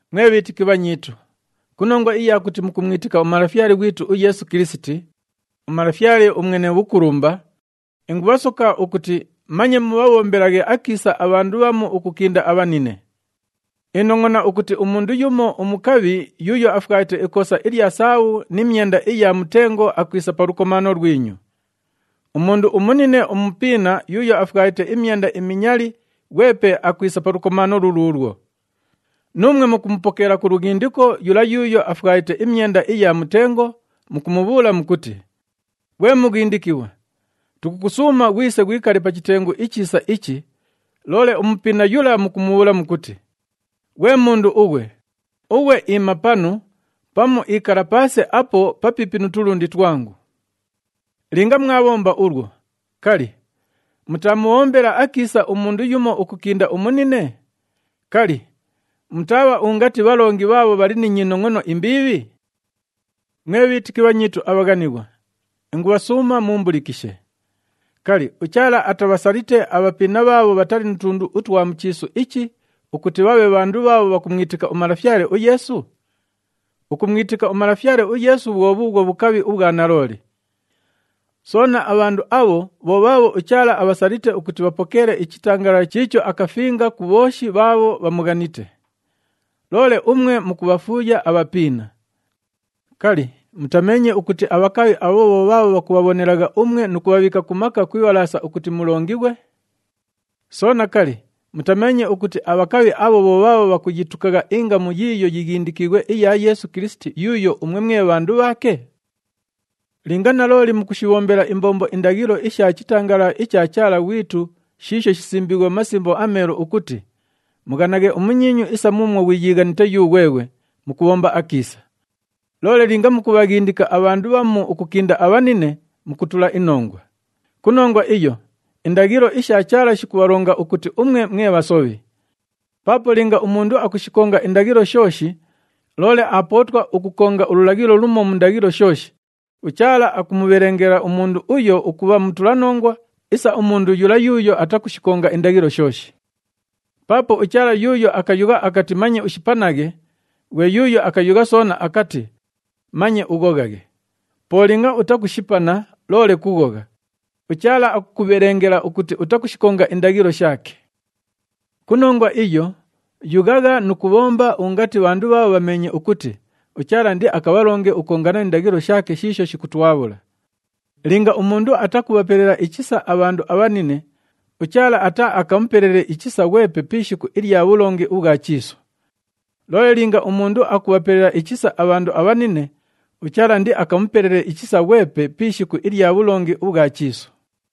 Mwe bhiitiki bhanyiitu, ku nongwa iya kuti mukumwitika uMalafyale ghwitu uYeesu Kilisiti, uMalafyale uMwene Bhukulumba, ingubhasoka ukuti manye mubhabhombelaghe akiisa abhandu bhamu ukukinda abhanine. Inongʼona ukuti umundu yumo umukabhi yuuyo afwalite ikoosa ilya sahabhu ni myenda iya mutengo akwisa pa lukomaano lwinyu. Umundu umunine umupiina yuuyo afwalite imyenda iminyali ghwepe akwisa pa lukomaano luluulwo. Nuumwe mukumupokeela ku lughindiko yula yuuyo afwalite imyenda iya mutengo, mukumubhuula mukuti, “Ghwe mughindikighwa, tukukusuuma ghwise ghwikale pa chitengu ichiisa ichi,” loole umupiina yula mukumubhuula mukuti, “Ghwe mundu ughwe, ughwe iima panu, pamu ikala paase apo papiipi nu tulundi twangu.” Linga mwabhomba ulwo, kali, mutaamubhombela akiisa umundu yumo ukukinda umunine? Kali, mutaabha ungati bhalongi bhaabho bhali ni nyinongʼono imbiibhi? Mwe bhiitiki bhanyiitu abhaghanighwa, ingubhasuuma muumbulikishe. Kali, uChaala atabhasalite abhapiina bhaabho bhatali nu tundu utwa mu chiisu ichi ukuti bhabhe bhandu bhaabho bhakumwitika uMalafyale uYeesu? Ukumwitika uMalafyale uYeesu bhwo bhuubhwo bhukabhi ubhwa nalooli. Soona, abhandu abho bho bhaabho uChaala abhasalite ukuti bhapokeele ichitangalala chiicho akafinga ku bhooshi bhaabho bhamughanite. Loole umwe mukubhafuuya abhapiina! Kali, mutameenye ukuti abhakabhi abho bho bhaabho bhakubhabhonelagha umwe nu kubhabhiika ku maka ku ibhalaasa ukuti mulongighwe? Soona, kali, mutameenye ukuti abhakabhi abho bho bhaabho bhakuyitukagha ingamu yiiyo yighindikiighwe iya Yeesu Kilisiti yuuyo umwe mwe bhandu bhaake? Linga nalooli mukushibhombela imbombo indaghilo isha chitangalala icha Chaala ghwitu shiisho shisimbiighwe mu Masimbo aMeelu ukuti, “Mughanaghe umunyiinyu isa muumwo ghwiyiighanite yughweghwe,” mukubhomba akiisa. Loole linga mukubhaghindika abhandu bhamu ukukinda abhanine, mukutula inongwa. Ku nongwa iyo, indaghilo isha Chaala shikubhalonga ukuti umwe mwe bhasobhi. Paapo linga umundu akushikonga indaghilo shooshi, loole aapootwa ukukonga ululaghilo lumo mu ndaghilo shooshi, uChaala akumubhelengela umundu uyo ukubha mutulanongwa isa umundu yula yuuyo atakushikonga indaghilo shooshi. Paapo uChaala yuuyo akayugha akati, “Manye ushipanaghe,” ghwe yuuyo akayugha soona akati, “Manye ughoghaghe.” Po linga utakushipana loole kughogha, uChaala akukubhelengela ukuti utakushikonga indaghilo shaake. Ku nongwa iyo, yughagha nu kubhomba ungati bhandu bhaabho bhameenye ukuti uChaala indiakabhalonge ukukongana ni ndaghilo shaake shiisho shikutwabhula. Linga umundu atakubhapelela ichisa abhandu abhanine, uChaala ataaakamupelele ichisa ghwepe pi ishiku ilya bhulongi ubhwa chiisu. Loole linga umundu akubhapelela ichisa abhandu abhanine, uChaala indiakamupelele ichisa ghwepe pi ishiku ilya bhulongi ubhwa chiisu.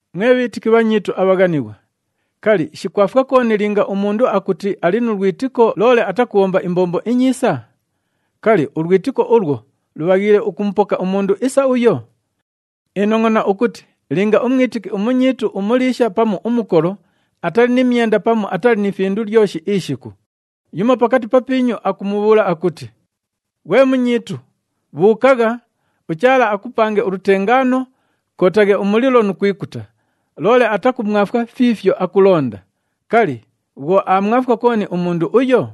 Mwe bhiitiki bhanyiitu abhaghanighwa, kali, shikwafwa kooni linga umundu akuti ali nu lwitiko, loole atakubhomba imbombo inyiisa? Kali, ulwitiko ulwo lubhaghiile ukumupoka umundu isa uyo? Inongʼona ukuti linga umwitiki umunyiitu umuliisha pamu umukolo atali ni myenda pamu atali ni findu lyoshi ishiku, yumo pakati papiinyu akumubhuula akuti, “Ghwe munyiitu, bhuukagha, uChaala akupange ulutengaano, kootaghe umulilo nu kwikuta,” loole atakumwafwa fiifyo akulonda, kali, bhwo aamwafwa kooni umundu uyo?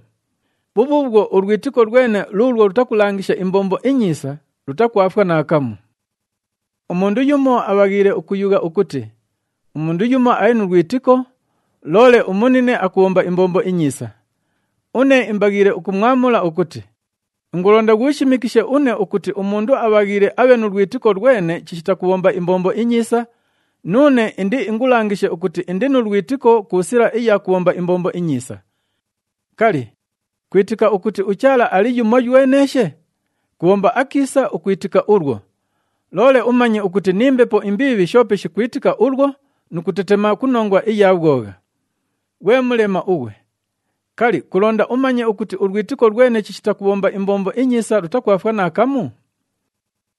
Bhubhuubhwo ulwitiko lwene luulwo lutakulangisha imbombo inyiisa, lutakwafwa naakamu. Umundu yumo abhaghiile ukuyugha ukuti, “Umundu yumo ali nu lwitiko, loole umunine akubhomba imbombo inyiisa.” Une imbaghiile ukumwamula ukuti, “Ingulonda ghuushimikishe une ukuti umundu abhaghiile abhe nu lwitiko lwene chishita kubhomba imbombo inyiisa, nuune indiingulangishe ukuti indi nu lwitiko ku sila iya kubhomba imbombo inyiisa.” Kali, kwitika ukuti uChaala ali yumoyweneeshe? Kubhomba akiisa ukwitika ulwo, loole umanye ukuti ni mbepo imbiibhi shoope shikwitika ulwo nu kutetema ku nongwa iya bhwogha. Ghwe mulema ughwe! Kali, kulonda umanye ukuti ulwitiko lwene chishita kubhomba imbombo inyiisa lutakwafwa naakamu?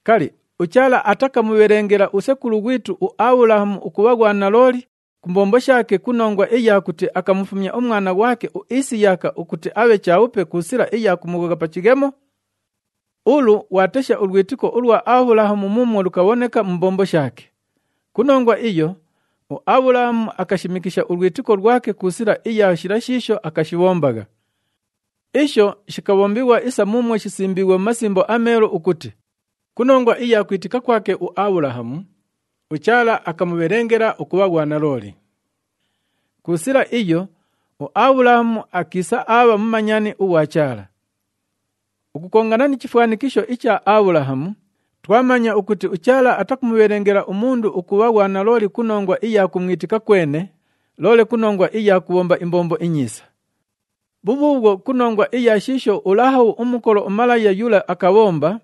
Kali, uChaala atakamubhelengela usekulu ghwitu uAbhulahamu ukubha ghwanalooli ku mbombo shaake ku nongwa iya kuti akamufumya umwana ghwake uIsiyaka, ukuti abhe chabhupe ku sila iya kumughogha pa chighemo? Ulu ghwatesha ulwitiko ulwa Abhulahamu muumwo lukabhoneka mu mbombo shaake. Ku nongwa iyo, uAbhulahamu akashimikisha ulwitiko lwake ku sila iya shila shiisho akashibhombagha. Isho shikabhombighwa isa muumwo shisimbiighwe mu Masimbo aMeelu ukuti, “Ku nongwa iya kwitika kwake uAbhulahamu, uChaala akamubhelengela ukubha ghwanalooli.” Ku sila iyo uAbhulahamu akiisa aabha mumanyani ughwa Chaala. Ukukongana ni chifwanikisho icha Abhulahamu, twamanya ukuti uChaala atakumubhelengela umundu ukubha ghwanalooli ku nongwa iya kumwitika kwene, loole ku nongwa iya kubhomba imbombo inyiisa. Bhubhuubhwo ku nongwa iya shiisho uLahabhu umukolo umalaya yula akabhomba,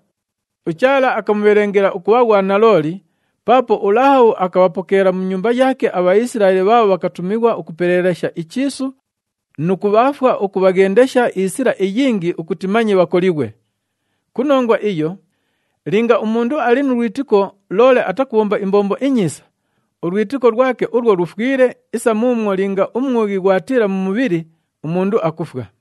uChaala akamubhelengela ukubha ghwanalooli, paapo uLahabhu akabhapokeela mu nyumba yaake aBhaisilaeli bhaabho bhakatumighwa ukupeleelesha ichiisu nu kubhaafwa ukubhaghendesha isila iyingi ukuti manye bhakolighwe. Ku nongwa iyo, linga umundu ali nu lwitiko loole atakubhomba imbombo inyiisa, ulwitiko lwake ulwo lufwile isa muumwo linga umwughi ghwatiila mu mubhili, umundu akufwa.